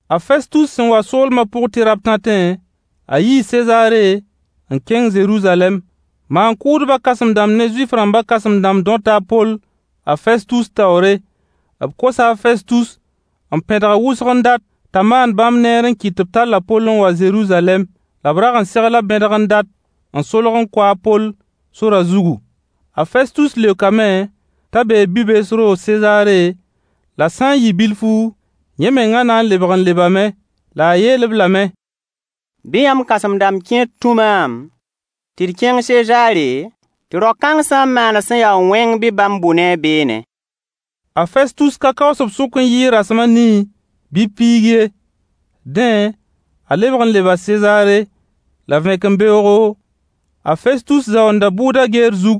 A Festus sẽn wa soolma pʋg tɩ rabtãtẽ, a yii Sezaare n kẽng Zeruzalɛm. Maan-kʋʋdbã kãsem-dãmb ne Zuif-rãmba kãsem-dãmb dõta a Poll a Festus taoore. B kosa a Festus n pẽdg-a wʋsg n dat t'a maan bãmb neer n kɩt tɩ b tall a Poll n wa Zeruzalɛm, la b rag n segla bẽdg n dat n solg n kʋ-a Poll sorã zugu. A Festus leokame t'a bee bi-bees roog Sezaare, la sã n yɩ bilfu, yẽ menga na n lebg n lebame. La a yeel-b lame: Bɩ yãmb kãsem-dãmb kẽer tũ maam tɩ d kẽng Sezaare, tɩ rao-kãng sã n maana sẽn ya wẽng bɩ bãmb bʋ ne-a beene. A Festus ka kaoos b sʋk n yɩɩg rasem a nii bɩ piig ye. Dẽ a lebg n leba Sezaare. La vẽkembeoogo, a Festus zaoonda bʋʋda geer zug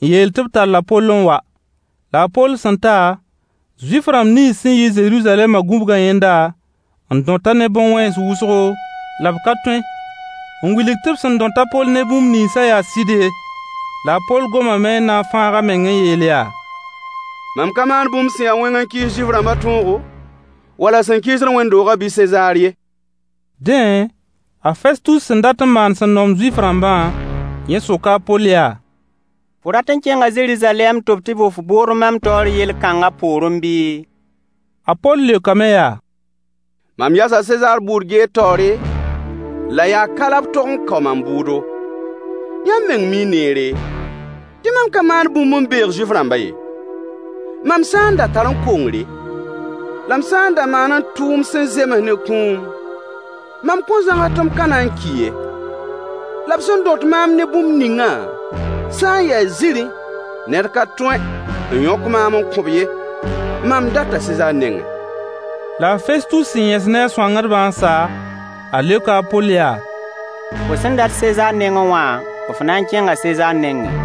n yeel tɩ b tall a Poll n wa. La a Poll sẽn ta, Zuif-rãmb nins sẽn yi Zeruzalɛma gũbga yẽnda n dõt-a ne bõn-wẽns wʋsgo, la b ka tõe n wilg tɩ b sẽn dõt a Poll ne bũmb ninsã yaa sɩd ye. La a Poll goma n na n fãag a meng n yeel yaa: Mam ka maan bũmb sẽn ya wẽng n kɩɩs Zuif-rãmba tõogo wala sẽn kɩɩsd wẽnd-doogã bɩ Sezaar ye. Dẽ, a Festus sẽn dat n maan sẽn noom Zuif-rãmbã, yẽ soka a Poll yaa: Fo rat n kẽnga Zeruzalɛm tɩ b tɩ bʋ f bʋʋd mam taoor yel-kãnga poorẽ bɩɩ? A Poll leokame yaa: Mam yasa Sezaar bʋʋd geer taoore, la yaa ka la b tog kao mam bʋʋdo. Yãmb meng mii neere, tɩ mam ka maan bũmb n beeg Zuif-rãmbã ye. Mam sã n da tarẽ kongre, la m sã n da maane tʋʋm sẽn zems ne kũum, mam kõn zãgs tɩ m ka na n ki ye. La b sẽn dõt maam ne bũmb ningã sã n ya zĩri, ned ka tõe n yõk maam n kõ-b ye. Mam data Sezaar nengẽ. La a Festus sẽn yẽs ne a sõangdbã n sa, a leoka a Poll yaa: Fo sẽn dat Sezaar nengẽ wã, f na n kẽnga Sezaar nengẽ.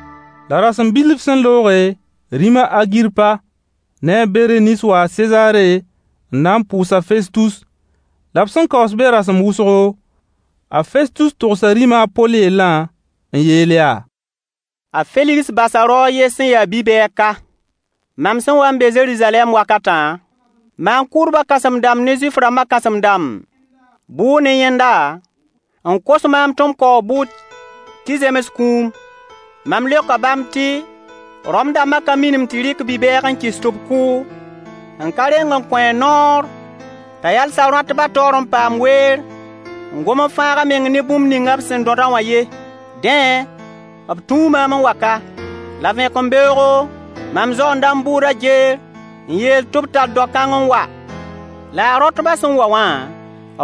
La rasem bilf sẽn looge, rĩm a Agirpa ne a Bereniis waa Sezaare n na n pʋʋs a Festus. La b sẽn kaoos be rasem wʋsgo, a Festus togsa rĩma a Poll yellã n yeel yaa: A Feligs basa rao a yen sẽn ya bi-bɛɛg ka. Mam sẽn wa n be Zeruzalɛm wakatã, maan-kʋʋdbã kãsem-dãmb ne Zuif-rãmbã kãsem-dãmb bʋʋ ne yẽnda n kos maam tɩ m kao a bʋʋd tɩ zems kũum. Mam leoka bãmb tɩ Rom-dãmba ka minim tɩ rɩk bi-bɛɛg n kɩs tɩ b kʋ, n ka reng n kõ-a noor t'a yals a rõatbã taoor n paam weer n gom n fãag a meng ne bũmb ninga b sẽn dõd-a wã ye. Dẽ, b tũu maam n wa ka. La vẽkembeoogo mam zaoonda m bʋʋda geer n yeel tɩ b tall rao-kãng n wa. La a rõatbã sẽn wa wã,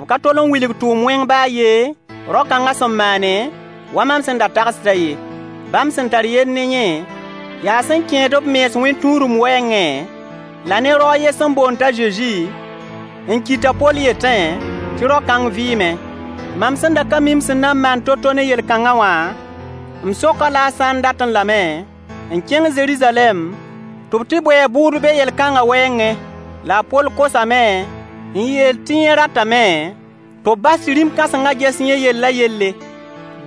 b ka tol n wilg tʋʋm wẽng ba a yen rao-kãnga sẽn maane, wa mam sẽn da tagsdã ye. Bãmb sẽn tar yell ne yẽ, yaa sẽn kẽed b mens wẽn-tũudum wɛɛngẽ, la ne rao a yen sẽn boond t'a Zezi n ki t'a poll yetẽ tɩ rao-kãng vɩɩme. Mam sẽn da ka mi m sẽn na n maan to-to ne yel-kãngã wã, m sok-a-la a sã n datẽ lame n kẽng Zeruzalɛm tɩ b tɩ bʋ a bʋʋd be yel-kãngã wɛɛngẽ. La a Poll kosame n yeel tɩ yẽ ratame tɩ b bas tɩ rĩm-kãsengã ges yẽ yellã yelle.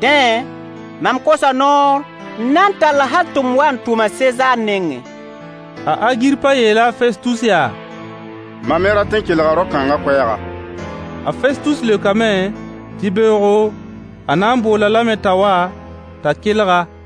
Dẽ, mam kosa noor n na n tall-a hal tɩ m wa n tʋm-a Sezaar nengẽ. A Agirpa yeela a Festus yaa: Mam me rat n kelga rao-kãngã koɛɛga. A Festus leokame tɩ beoogo, a na n bool-a lame t'a wa t'a kelg-a.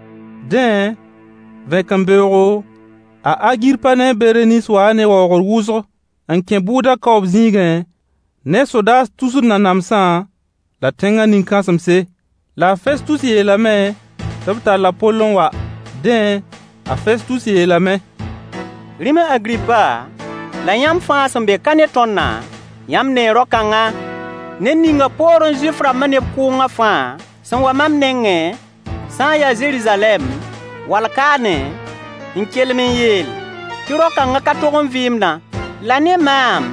Dẽ, vẽkembeoogo, a Agirpa ne a Bereniis waa ne waoogr wʋsg n kẽ bʋʋda kaoob zĩigẽ ne sodaas tusr nanamsã, la tẽngã nin-kãsemse. La a Festus yeelame tɩ b tall a Poll n wa. Dẽ, a Festus yeelame: Rĩm a Agirpa, la yãmb fãa sẽn be ka ne tõndã, yãmb nee rao-kãngã, ned ningã poorẽ Zuif-rãmbã neb kʋʋngã fãa sẽn wa mam nengẽ sã n ya Zeruzalɛm, wall kaane n kelem n yeel tɩ rao-kãngã ka tog n vɩɩmdã. La ne maam,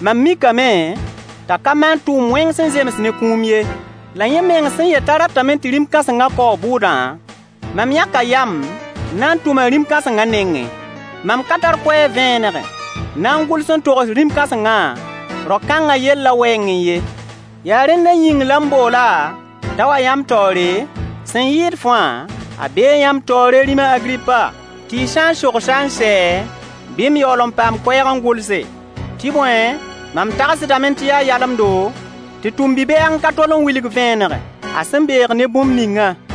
mam mikame t'a ka maan tʋʋm wẽng sẽn zems ne kũum ye. La yẽ meng sẽn yet t'a ratame tɩ rĩm kãsengã kaoo a bʋʋdã, mam yãka yam n na n tʋm-a rĩm kãsengã nengẽ. Mam ka tar koɛɛg vẽeneg n na n gʋls n togs rĩm kãsengã rao kãngã yellã wɛɛngẽ ye. Yaa rẽndã yĩng la m bool-a t'a wa yãmb taoore, sẽn yɩɩd fãa, a bee yãmb taoore rĩm a Agirpa, tɩ y sã n sogs-a n sɛ, bɩ m yaool n paam koɛɛg n gʋlse. Tɩ bõe, mam tagsdame tɩ yaa yalemdo tɩ tʋm bi-bɛɛg n ka tol n wilg vẽeneg a sẽn beeg ne bũmb ningã.